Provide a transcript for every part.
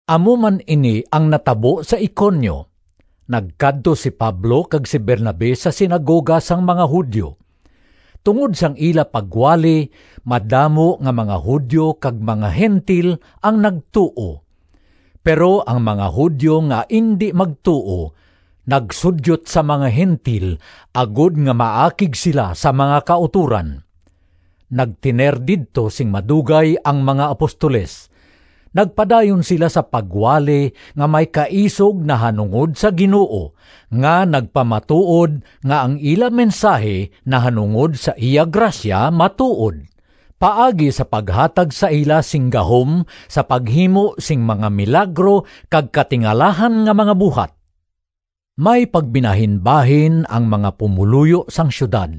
Amo man ini ang natabo sa Iconio. Nagkadto si Pablo kag si Bernabe sa sinagoga sang mga Judio. Tungod sang ila pagwali madamo nga mga Judio kag mga Gentil ang nagtuo. Pero ang mga Judio nga indi magtuo nagsudyot sa mga Gentil agod nga maakig sila sa mga kautoran. Nagtener didto sing madugay ang mga apostoles. Nagpadayon sila sa pagwali nga may kaisog nahanungod sa Ginoo nga nagpamatuod nga ang ila mensahi nahanungod sa iya grasya matuod, paagi sa paghatag sa ila sing gahom sa paghimo sing mga milagro kag katingalahan nga mga buhat. May pagbinahinbahin ang mga pumoluyo sang siyudad.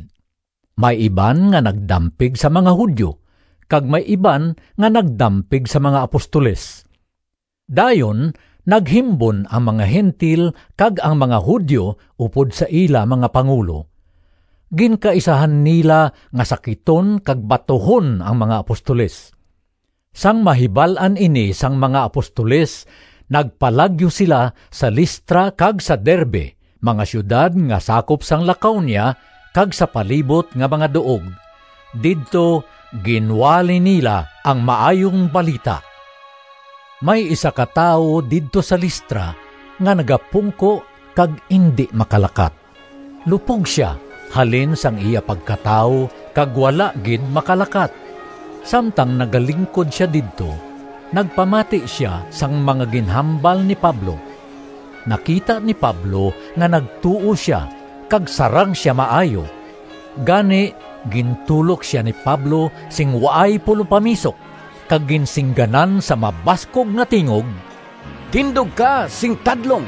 May iban nga nagdampig sa mga Judio, kag may iban nga nagdampig sa mga apostoles. Dayon naghimbon ang mga Gentil kag ang mga Judio upod sa ila mga pangulo. Ginkaisahan nila nga sakiton kag batuhon ang mga apostoles. Sang mahibal-an ini sang mga apostoles nagpalagyo sila sa Listra kag sa Derbe, mga siyudad nga sakop sang Lacaonia, kag sa palibot nga mga duog. Didto ginwali nila ang Maayong Balita. May isa ka tawo didto sa Listra nga nagapungko kag indi makalakat. Lupog sia halin sang iya pagkatawo kag wala gid makalakat. Samtang nagalingkod sia didto nagpamati sia sang mga ginhambal ni Pablo. Nakita ni Pablo nga nagtuo sia kag sarang sia maayo, gani gintulok sia ni Pablo sing waay pulopamisok kag ginsingganan sa mabaskog nga tingog, “Tindog ka sing tadlong!”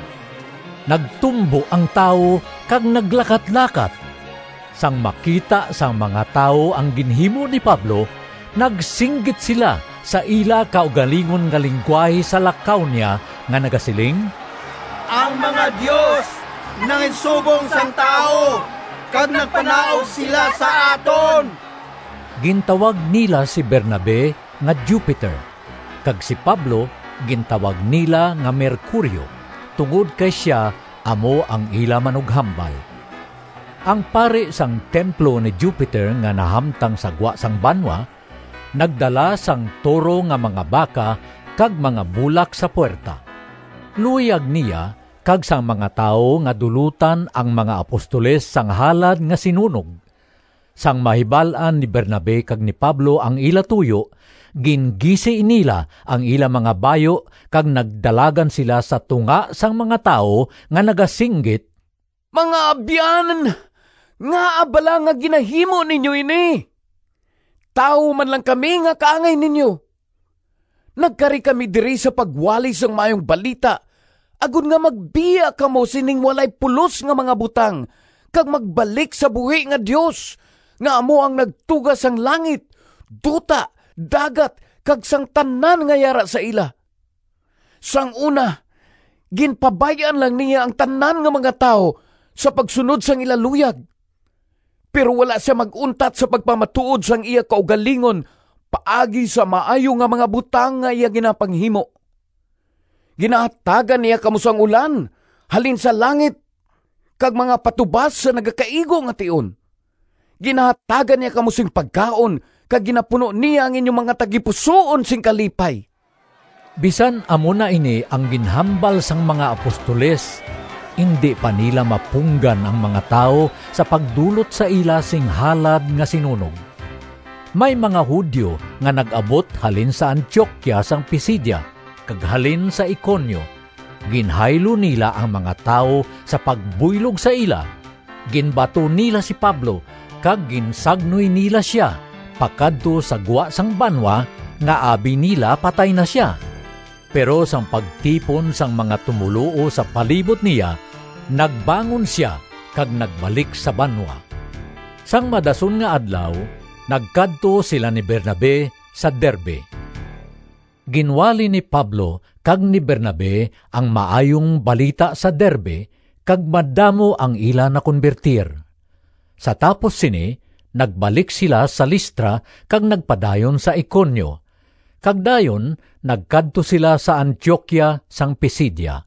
Nagtumbo ang tawo kag naglakatlakat. Sang makita sang mga tawo ang ginhimo ni Pablo, nagsinggit sila sa ila kaugalingon nga linggwahe sa Lacaonia nga nagasiling, “Ang mga dios nanginsubong sang tawo kag nagpanaog sila sa aton!” Gintawag nila si Bernabe nga Jupiter, kag si Pablo gintawag nila nga Mercurio tungod kay sia amo ang ila manughambal. Ang pari sang templo ni Jupiter nga nahamtang sa gwa sang banwa, nagdala sang toro nga mga baka kag mga bulak sa puwerta. Luyag niya kag sang mga tawo nga dulotan ang mga apostoles sang halad nga sinunog. Sang mahibal-an ni Bernabe kag ni Pablo ang ila tuyo, gingisi nila ang ila mga bayu kag nagdalagan sila sa tunga sang mga tawo nga nagasinggit, “Mga abyan, ngaa bala nga ginahimo ninyo ini? Tawo man lang kami nga kaangay ninyo! Nagkari kami diri sa pagwali sang Maayong Balita agod nga magbiya kamo sining walay pulos nga mga butang kag magbalik sa buhi nga Dios, nga amo ang nagtuga sang langit, duta, dagat, kag sang tanan nga yara sa ila. Sang una ginpabay-an lang niya ang tanan nga mga tawo sa pagsunod sang ila luyag. Pero wala sia mag-untat sa pagpamatuod sang iya kaugalingon paagi sa maayo nga mga butang nga iya ginapanghimo. Ginahatagan niya kamo sang ulan halin sa langit kag mga patubas sa nagakaigo nga tion. Ginahatagan niya kamo sing pagkaon kag ginapuno niya ang inyo mga tagipusoon sing kalipay.” Bisan amo na ini ang ginhambal sang mga apostoles, indi pa nila mapunggan ang mga tawo sa pagdulot sa ila sing halad nga sinunog. May mga Judio nga nag-abot halin sa Antioquia sang Pisidia kag halin sa Iconio; ginhaylo nila ang mga tawo sa pagbuylog sa ila, ginbato nila si Pablo, kag ginsagnoy nila sia pakadto sa gwa sang banwa nga abi nila patay na sia. Pero sang pagtipon sang mga tumoluo sa palibot niya, nagbangon sia kag nagbalik sa banwa. Sang madason nga adlaw nagkadto sila ni Bernabe sa Derbe. Ginwali ni Pablo kag ni Bernabe ang Maayong Balita sa Derbe kag madamo ang ila nakonbertir. Sa tapos sini nagbalik sila sa Listra kag nagpadayon sa Iconio, kag dayon nagkadto sila sa Antioquia sang Pisidia.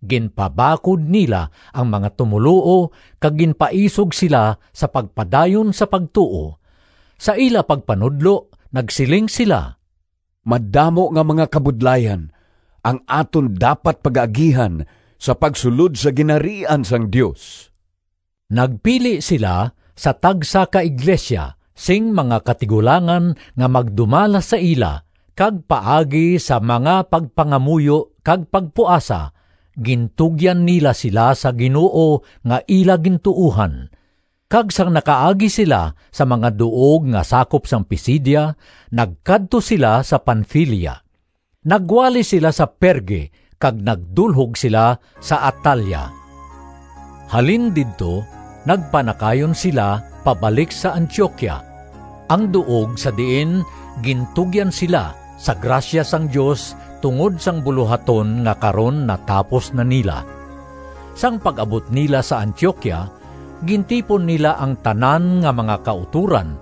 Ginpabakod nila ang mga tumoluo kag ginpaisog sila sa pagpadayon sa pagtuo. Sa ila pagpanudlo nagsiling sila, “Madamo nga mga kabudlayan ang aton dapat pagaagihan sa pagsulod sa Ginharian sang Dios.” Nagpili sila sa tagsa ka iglesia sing mga katigulangan nga magdumala sa ila kag paagi sa mga pagpangamuyo kag pagpuasa gintugyan nila sila sa Ginoo nga ila gintuohan. Kag sang nakaagi sila sa mga duog nga sakop sang Pisidia, nagkadto sila sa Panfilia. Nagwali sila sa Perge kag nagdulhog sila sa Atalia. Halin didto nagpanakayon sila pabalik sa Antioquia, ang duog sa diin gintugyan sila sa grasya sang Dios tungod sang bulohaton nga karon natapos na nila. Sang pag-abot nila sa Antioquia, gintipon nila ang tanan nga mga kautoran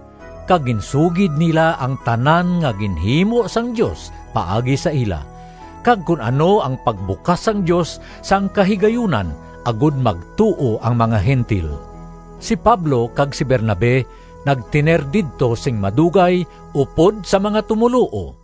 kag ginsugid nila ang tanan nga ginhimo sang Dios paagi sa ila, kag kon ano ang pagbukas sang Dios sang kahigayunan, agod magtuo ang mga Gentil. Si Pablo kag si Bernabe nagtener didto sing madugay upod sa mga tumoluo.